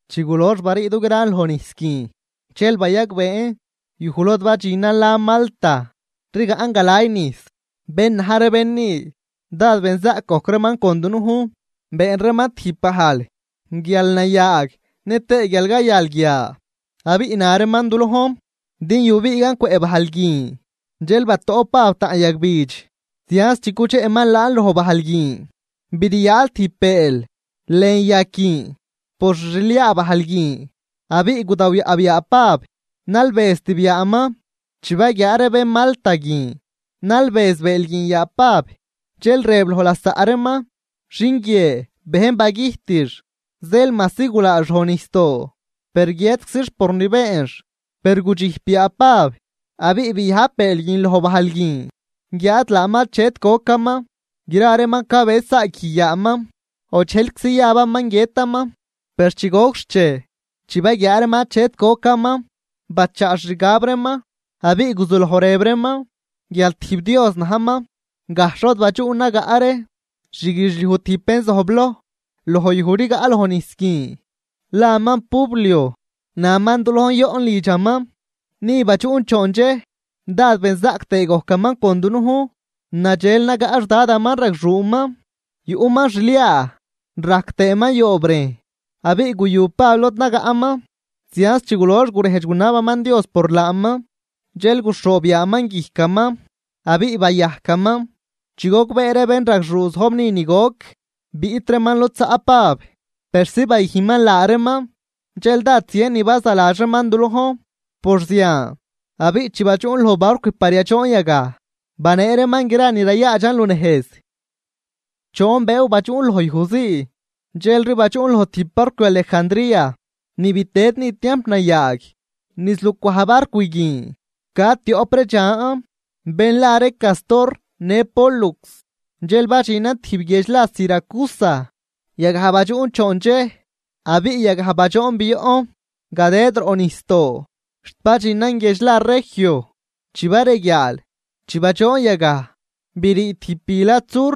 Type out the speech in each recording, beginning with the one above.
Chi gulox barii dugran lon nijs guin, dxel bayagbeen yuj lod badxinan lan Malta rigaꞌn galay nijs. Bén na̱j ree bén ni, dád benzaꞌc gojc reeman con dunujn. Been reeman tijb bajl guial nayaag nëtëë guial cayal guia, abiꞌ na reeman du lojn din yubiigan cwëꞌ bajl guin. Dxel batoꞌp Pab taꞌn yagbidx, zianz chi cudxeꞌman laan loj bajl guin briyaal tijb bëël lën yag guin por xi xliaa bajl guin, abiꞌ gudawyaꞌb yaa Pab nalbëztib yaaman. Chi baguiaa ree bén Malta guin nalbëz bëël guin yaa Pab, dxel rëb loj lasaꞌ reeman: ―Xin guie bejn bagüjtix, zeel majsi gulaax loj nijsdoo, per guiëtczix por ni beenx. Per gudxijp yaa Pab abiꞌ biajb bëël guin loj bajl guin, guiáad laaman achet gocaman. Gra reeman cabëz saaguij yaaman, o dxejlczi yabaman guiëtaman. Per chi gojc xchej, chi baguiaa reeman achet gocaman, bachaa xixgab reeman abiꞌ guzuloj rëb reeman guial tijb dios najman. Gajxh lod badxuꞌn nagaꞌ ree xguidxliuj tijb bén zojbloj loj yuj rigaꞌ loj nijs guin, laman Publio. Naman du lojn yoꞌn lidxaman, ni badxuꞌn choon dxej, dád benzaꞌc tëë gojcaman con dunujn. Nadxel nagaꞌ xdadaman, ragxuuman, yuꞌman xliaa rajc tëëman yoobrejn. Abiꞌ guyu Pab lod nagaꞌman, zianz chi gulox gurejdx gunabaman Dios por laaman, dxel guxhoob yaaman guijcaman abiꞌ bayajcaman. Chi gogbee ree bénragxuu zojb ni ni goc, biꞌt reeman lod zaꞌ Pab persi bayüjnman laa reeman. Dxel dád zien ni bazaladx reeman du lojn por zian. Abiꞌ chi badxuꞌn loj barcw par yadxoon yagaj, banee reeman gra ni rayaadxan lunejz. Choon bëëw badxuꞌn loj yuj zii, dxelri badxuꞌn loj tijb barcw Alejandría, ni bitëd ni tiamp nayaag. Niz lucwaj barcw guin ca tioꞌp ree dxan bén la ree Cástor në Pólux. Dxel badxinan tijb guiedx la Siracusa, yagaj badxuꞌn choon dxej. Abiꞌ yagaj badxoon bioꞌn gadëd roꞌ nijsdoo xt badxinan guiedx la Regio. Chi bareguiaal, chi badxoon yagaj, brii tijb bi lad sur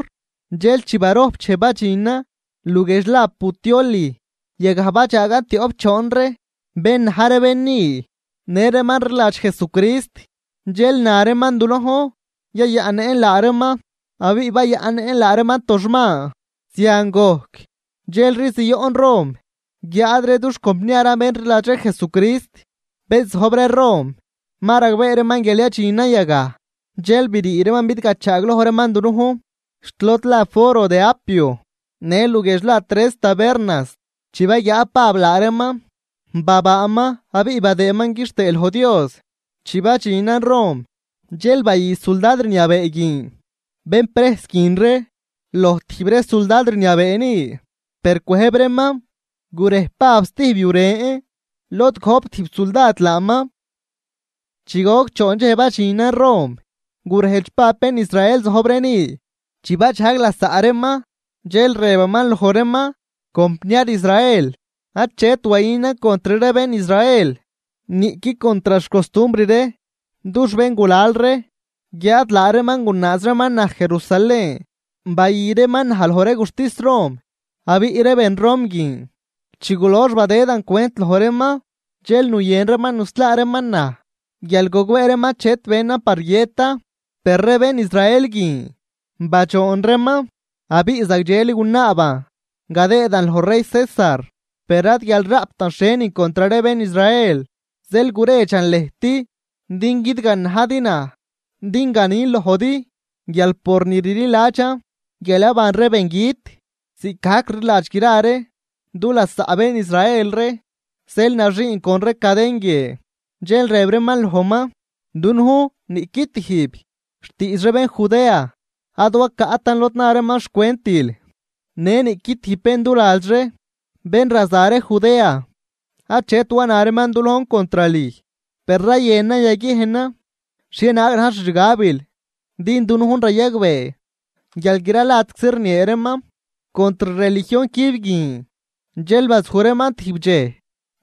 dxel ni barojp dxej badxinan luguiedx la Puteoli. Yagaj badxaagan tioꞌp choon ree bén na̱j ree bén ni në reeman rliladx Jesucrist, dxel na reeman du lojn yayaꞌnnëꞌn laa reeman abiꞌ bayaꞌnnëꞌn laa reeman toxman. Zian gojc, dxelri zioꞌn Rom. Guiáad ree dux compniaran bén rliladx ree Jesucrist, bén zojb ree Rom, ma ragbee reeman guial yadxinan yagaj. Dxel brii reeman bidgachaagloj reeman dunujn xt lod la Foro de Apio në luguiedx la Tres Tabernas. Chi baguiaa Pab laa reeman, babaaman abiꞌ badëëman quixtëë loj Dios. Chi badxinan Rom, dxel bayü suldad rniabee guin bén prejs guin ree loj tijb ree suldad rniabee ni. Per cwëjb reeman gurej Pab stijb yu ren lod gojp tijb suldad laaman. Chi goc choon dxej badxinan Rom, gurejdx Pab bén Israel zojbloj ree ni. Chi badxajg lasaꞌ reeman, dxel rëbaman loj reeman: ―Compniar Israel, achet wayünan contr ree bén Israel niꞌqui contr xcostumbr ree dux béngulal ree. Guiáad laa reeman gunaaz reeman naj Jerusalén, bayü reeman naj loj ree guxtis Rom. Abiꞌ ree bén Rom guin chi gulox badëdan cwent loj reeman, dxel nuyën reeman nuslaa reeman naj, guial gogbee reeman achet benan par guiëtan. Per ree bén Israel guin badxoon reeman abiꞌ zagdxeli gunaaban gadëëdan loj rey César, per ad guial raꞌptan xhienin contr ree bén Israel. Zeel guredxan lëjt, din guidganajdi naj din ganin lojdi guial por ni rliladxan guial yaban ree bengüt ziꞌcgajc rliladx gra ree du lasaꞌ bén Israel ree, zeel naxiin con ree caden guie. Dxel rëb reeman lojman: ―Dunujn niꞌqui tijb xtiidx ree bén Judea ad wacaꞌtan lod na reeman xcwentil, në niꞌqui tijb bén duladx ree bén raza ree Judea achet wana reeman du lojn contr lüj. Per rayënan yaguiejnan xhienaag na̱j xixgabil, din dunujn rayagbee guial gra ladczi rniee reeman contr religion cüb guin. Dxel bazuj reeman tijb dxej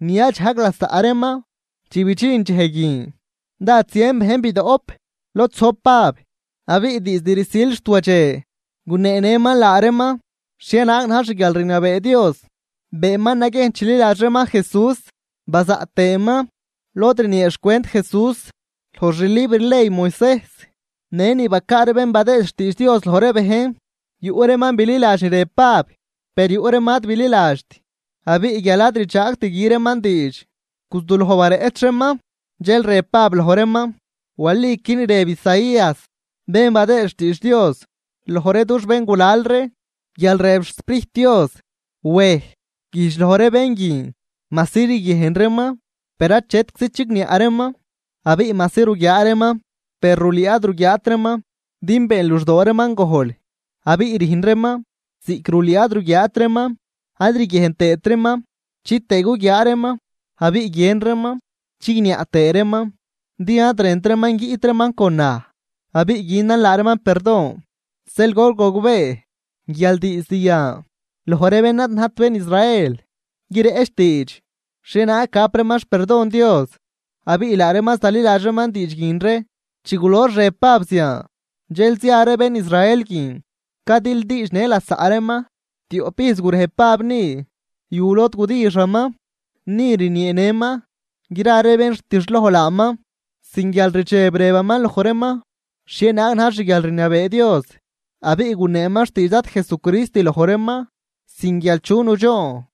ni yadxajg lasaꞌ reeman. Chi bidxin dxej guin, dád zien bejn bidoꞌp lod zojb Pab. Abiꞌ diizd rsil xt wadxe guneenëman laa reeman xhienaag na̱j xguialrniabee Dios. Beenman naguiejn chililadx reeman Jesús, bazaꞌt tëëman lod rniee xcwent Jesús loj xlibr ley Moisejs në ni bacaa ree bén badëë xtiidx Dios loj ree bejn. Yuꞌ reeman bililadx ni rëb Pab, per yuꞌ reeman ad bililadxt. Abiꞌ guial ad rdxaagt gü reeman diidx, guzuloj bareꞌch reeman. Dxel rëb Pab loj reeman: ―Waliqui ni rëb Isaías bén badëëd xtiidx Dios loj ree dux béngulal ree guial rëb xSprijt Dios: Wej, güjdx loj ree bén guin: Majsi riguiejn reeman, per achetczi chigniaꞌ reeman, abiꞌ majsi ruguiaa reeman, per rulüü ad ruguiaat reeman. Din been luxdoo reeman gojl, abiꞌ rüjn reeman ziꞌc rulüü ad ruguiaat reeman, ad riguiejn tëët reeman, chitëë guguiaa reeman, abiꞌ guien reeman chigniaꞌ tëë reeman. Din ad rënt reeman guiꞌt reeman con naj, abiꞌ günan laa reeman perdon. Zeel gol gogbee guial diizd yan, loj ree bén ad najt bén Israel guireꞌch diidx xhienaag gap reeman xperdon Dios, abiꞌ laa reeman zaliladx reeman diidx guin ree. Chi gulox rëb Pab zian, dxel zia ree bén Israel guin, cadildiidxnë lasaꞌ reeman. Tioꞌp ijz gurej Pab ni, yu lod gudixaman. Ni rnieenëman gra ree bén rtixloj laaman. Sin guialrdxeb rëbaman loj reeman xhienaag na̱j xguialrniabee Dios, abiꞌ guneeman xtiidx Dad Jesucrist loj reeman sin guial chu nudxoon.